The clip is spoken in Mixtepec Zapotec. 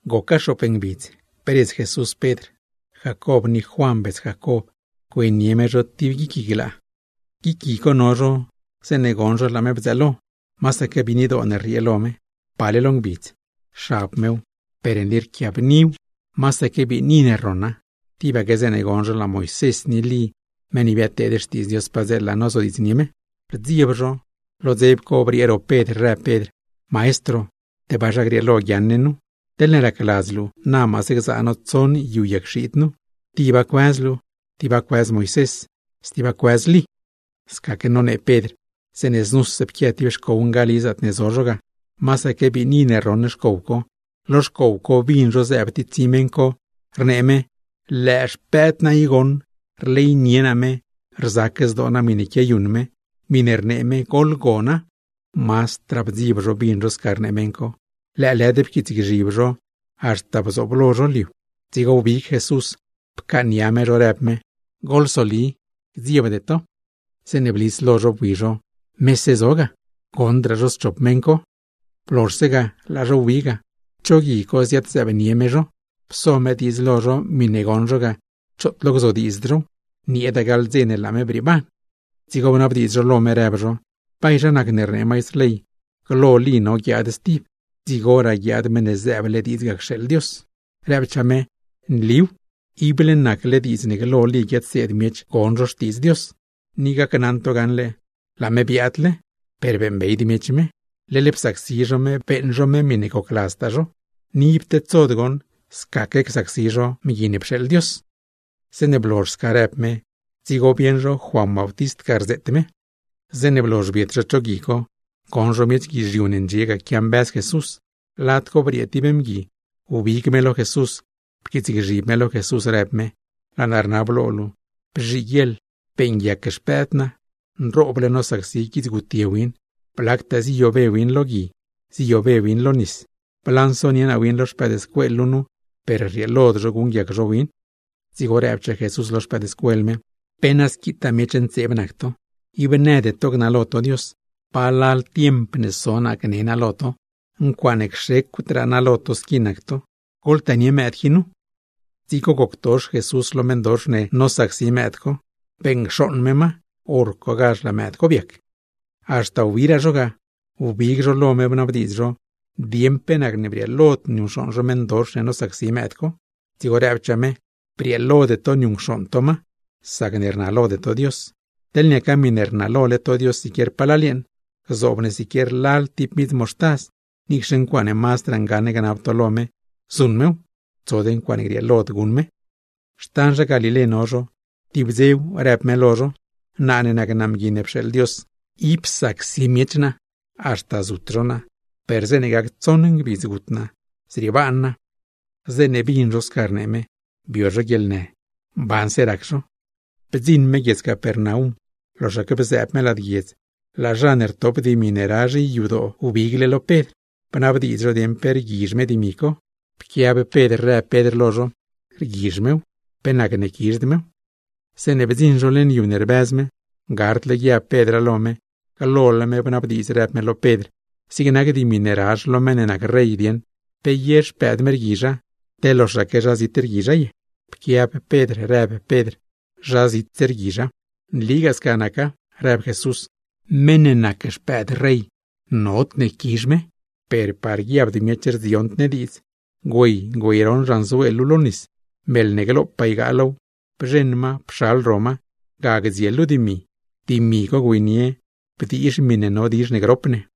Goca xoop ngbidz, bredz Jesús Pedr, Jacob ni Juan bets Jacob güeynie me zho tib guic gui glaa. Guic gui co no zho, zeeṉe goṉ zho laa me bdzëëlo. Masaque biinidoo rriee lo me, pale lo ngbidz; xab mew, per nli rquiabniw, masaque biini ne rroṉa. Tibaque zeeṉe goṉ zho laa Moisés ni Lí meṉ ne biadteed xtiidz Dios padzeela, nozodiidznie me. Rdzieb zho, lo dzeb co briee ro Pedr rëb Pedr: ―Maestro, ¡tebaa zha grieelo guiaaṉ ne nu! Teḻne racladz luu, na maase gzaa no tsoṉ yu yag xiid nu, tiba cuëz luu, tiba cuëz Moisés, stiba cuëz Lí. Scaque nonee Pedr, zeeṉe znuse pquia tib xcow ngali zaatne zo zho ga, masaque biini ne rroṉ xcow co, lo xcow co bin zho zëëb tsi tib meṉ co, rnee me: ―Lëë xpëëd naa i goṉ, rleynie naa me, rzac zdoo naa miṉe quiayuṉ me. Miṉe rnee me, goḻgona. Mazdraa bdzieb zho bin zho sca rnee meṉ co, lëëlëd pquiitsgzhib zho haxta bdziṉ lo zho lo liu. Dzigo wbig Jesús, pcaaṉnia me zho, rëb me: ―Goḻsoli, gdziebde to. Zeeṉe blis lo zho bui zho, mese zo ga, goṉdraa zho schop meṉ co. Blozhse ga, laa zho wbi ga. Cho gui co ziad-zëëbnie me zho, pso me diidz lo zho miṉe goṉ zho ga, choot lo gzodiidzd zhow, nieeda gaḻ dze ne laa me brieeban. Dzigo bnabdiidz zho lo me, rëb zho: ―¿Bay zha nacne rnee maistr ley, glo Lí no guiaad stib, dzigoraa guiaad Meṉ ne zëëble diidz ga cxeeḻ Dios? Rëbchaa me: ―Nliw, ible nacle diidz ne glo Lí guiadseed miech gon zho xtiidz Dios. Ni gacnaṉ to gaṉle laa me biaadle, per beeṉbeyd miech me, leḻ psacsi zho me beeṉ zho me miṉe gocladztaa zho; ni ib tedsod goṉ, scaque csacsi zho Mgui ne pxeeḻ Dios. Zeeṉe blozh sca rëb me, dzigo bieṉ zho Juan Bautist ga rzeet me. Zeeṉe blozh biet zho cho gui co, goṉ zho miech guizhiu ndxie ga quiambëz Jesús. Lad co briee tib mgui, wbig me lo Jesús, pquiitsgzhib me lo Jesús, rëb me: ―Laa naa rnab lo luu, bzhiguieḻ beeṉguiac xpëëd naa, nrooble nosacsi guidz gutye win. Blactaa ziyobe win lo gui, ziyobe win lo nis ne. Blansonie naa win lo xpëëdscuel luu nu, per rrieelod zho guṉguiac zho win. Dzigo rëbchaa Jesús lo xpëëdscuel me: ―¡Pe na squitaa miech ntseeb nac to, ib nëde to gnalo to Dios! ¿Palal tiemp ne so naa gne naa lo to? ¡Ncuaaṉe cxecwdraa naa lo to squi nac to! ¡Goḻtënie mëëd qui nu! Dzigo goctox Jesús lo meṉdox ne nosacsi mëëd co, beṉcxooṉ me ma, hor cogazh laa mëëd co biac. Haxta wbiraa zho ga, wbig zho lo me bnabdiidz zho dieṉ pe nacne brieelod zho niuṉcxooṉ zho meṉdox ne nosacsi mëëd co. Dzigo rëbchaa me: ―Brieelode to niuṉcxooṉ to ma, sacne rnalode to Dios. Teḻ niaca miṉe rnalole to Dios siquier palal yeeṉ, gzoob ne siquier lal tib midz moxtaz, niicxe ncuaaṉe mazdraa ngaṉ gnab to lo me, zuṉ mew; tsod ncuaaṉe grieelod guṉ to. Xtan zha Galilé no zho, tib dzew rëb me lo zho: ―Naa ne nac Mgui ne pxeeḻ Dios, ib znaaz miech naa, haxta zut zho naa; per zeeṉe gac tsoṉ ngbidz gut naa, zriebaan naa. Zeeṉe bin zho sca rnee me, bio zho guieḻnë, mbanse rac zho. Bdziṉ me guiedz Capernaum, loxaque bzëëb me lad guiedz, laa zha ne rtop dimi ne razh yadoo wbigle lo Pedr, bnabdiidz zho dieṉ pe rguizh me dimi co. Pquiab Pedr rëb Pedr lo zho: ―Rguizh mew, ¿pe nacne quizhd mew? Zeeṉe bdziṉ zho leṉ yu ne rbëz me, gardle guiab Pedra lo me, glole me bnabdiidz rëb me lo Pedr: ―Zig nac dimi ne razh lo meṉ ne nac rey dieṉ, ¿pe ye xpëëd me rguizha, te loxaque zha zit rguizha ye? Pquiab Pedr rëb Pedr: ―Zha zitse rguizha. ―Nligaa sca naca ―rëb Jesús―. Zha ne nac mëëd nodne quizh zho, per par guiabd zho rdziond ne diidz, güey güeyroṉ xanzuel luu lo nis. Meḻ ne glopaa ygaa low, bzheṉ ma pxal ro ma, ga gdziel luu dimi; dimi co güeynie bdiizh miṉe no dizh ne grop ne.